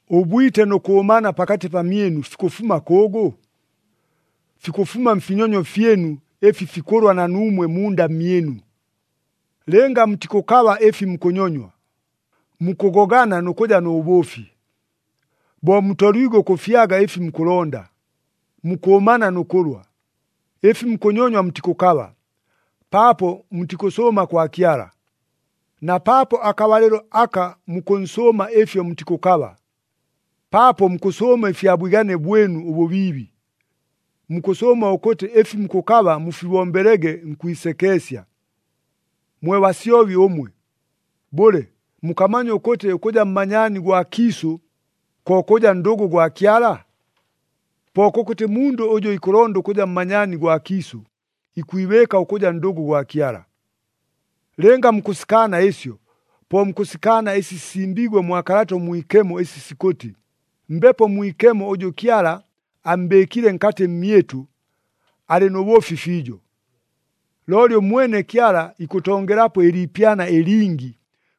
Ʉbwite nʉ kʉʉmana pakatɨ pamyɨnu fikʉfuma kʉʉgʉ? Fikʉfuma mfinyonyo fyɨnu, ɨfi fikʉlwa na nuumwe munda mmyɨnu. Lɨnga mutikʉkaba ɨfi mukʉnyonywa, mukʉgogana nʉ kʉja nʉ bʉʉfi. Bo mutoliigwe ʉkʉfyaga ɨfi mukʉlonda, mukʉʉmana nʉ kʉlwa. Ɨfi mukʉnyonywa mutikʉkaba, paapo mutikʉsʉʉma kwa Kyala! Na paapo akabalɨlo aka mukʉnsʉʉma ɨfyo mutikʉkaba, paapo mukʉsʉʉma ɨfya bwigane bwɨnu ʉbʉbiibi. Mukʉsʉʉma ʉkʉtɨ ɨfi mukʉkaba mufibombelege nkwisekeesya. Mwe basyobi ʉmwe! Bʉle, mukamanya ʉkʉtɨ ʉkʉja mmanyaani gwa kiisʉ, ko kʉja ndʉgʉ gwa Kyala? Po kʉkʉtɨ mundʉ ʉjʉ ikʉlonda ʉkʉja mmanyaani gwa kiisʉ, ikwibɨɨka ʉkʉja ndʉgʉ gwa Kyala. Lɨnga mukʉsikaana ɨsyo, po mukʉsikaana ɨsi sisimbiigwe mwa Kalata ʉMwikemo ɨsi sikʉtɨ, Mbepo Mwikemo ʉjʉ Kyala ammbɨɨkile nkatɨ mmyɨtʉ, alɨ nʉ bʉʉfi fiijo. Looli ʉmwene Kyala ikʉtongelapo ɨliipyana ɨlingi,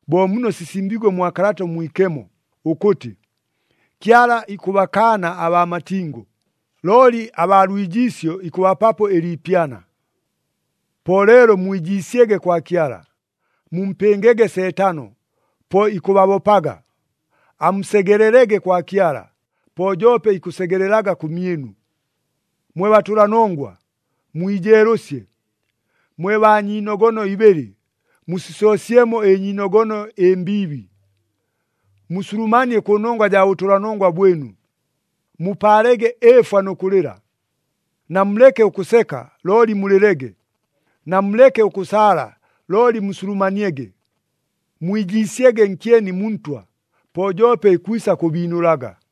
bo muno sisimbiigwe mwa Kalata ʉMwikemo, ʉkʉtɨ, “Kyala ikʉbakaana abaa matingo, looli abaa lwijiisyo ikʉbapapo ɨliipyana.” Po leelo mwijiisyege kwa Kyala. Mumpɨngege Seetano, po ikʉbabopaga. Amusegelelege kwa Kyala, po joope ikʉsegelelaga kʉmyɨnu. Mwe batʉlanongwa, mwijeelʉsye! Mwe baa nyiinogono ibɨlɨ, musisoosyemo ɨnyiinogono ɨmbiibi! Musulumanie kʉnongwa jaa bʉtʉlanongwa bwɨnu, mupaalege ɨɨfwa nʉ kʉlɨla. Namuleke ʉkʉseka looli mulɨlege, namuleke ʉkʉsaala looli musulumaniege. Mwijiisyege nkyeni mu Ntwa, po joope ikwisa kʉbiinʉlaga.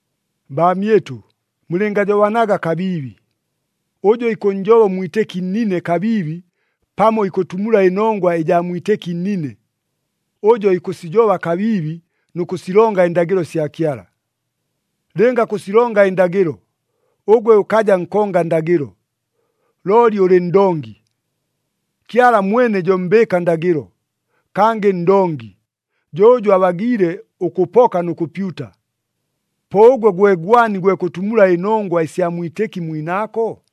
Baamyɨtʉ, mulɨngajobanaga kabiibi. Ʉjʉ ikʉnnjoba ʉmwitɨki nnine kabiibi pamo ikʉtumula ɨnongwa ɨjaa mwitɨki nnine, ʉjo ikʉsijoba kabiibi nʉ kʉsilonga ɨndagɨlo sya Kyala. Lɨnga kʉsilonga ɨndagɨlo, ʉgwe ʉkaja nkonga ndagɨlo, looli ʉlɨ ndongi. Kyala mwene jo mbɨɨka ndagɨlo, kangɨ ndongi. Jo ʉjʉ abagiile ʉkʉpoka nʉ kʉpyuta. Po ʉgwe gwe gwani gwe kʉtumula ɨnongwa ɨsya mwitɨki mwinaako?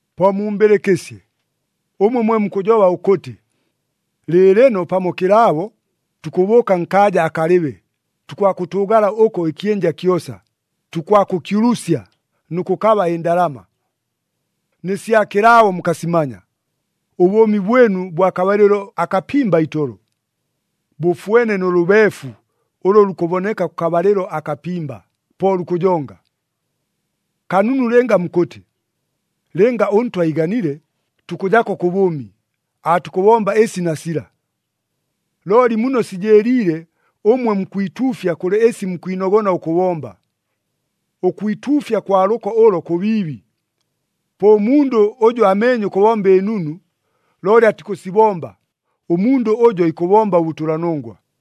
Po mumbɨlɨkɨsye, ʉmwe mwe mukʉjoba ʉkʉtɨ, “Lɨɨlɨno pamo kɨlaabo, tukʉbʉʉka nkaaja akalɨbe, tukwakʉtʉʉgala ʉko ɨkyɨnja kyosa, tukwakʉkyulusya nʉ kʉkaba ɨndalama.” Nɨ sya kɨlaabo mukasimanya! Ʉbʉʉmi bwɨnu bwa kabalɨlo akapimba itolo! Bʉfwene nʉ lʉbeefu ʉlʉ lukʉboneka kʉkabalɨlo akapimba, po lukʉjonga! Kanunu lɨnga mukʉtɨ, “Lɨnga ʉNtwa iiganile, tukʉjako kʉ bʉʉmi, aatukʉbomba ɨsi na sila.” Looli muno sijɨɨliile, ʉmwe mukwituufya kʉlɨ ɨsi mukwinogona ʉkʉbomba. Ʉkwituufya kwa lʉko ʉlo kʉbiibi. Po ʉmundʉ ʉjʉ ameenye ʉkʉbomba ɨnunu, looli atikʉsibomba, ʉmundʉ ʉjo ikʉbomba ʉbʉtʉlanongwa.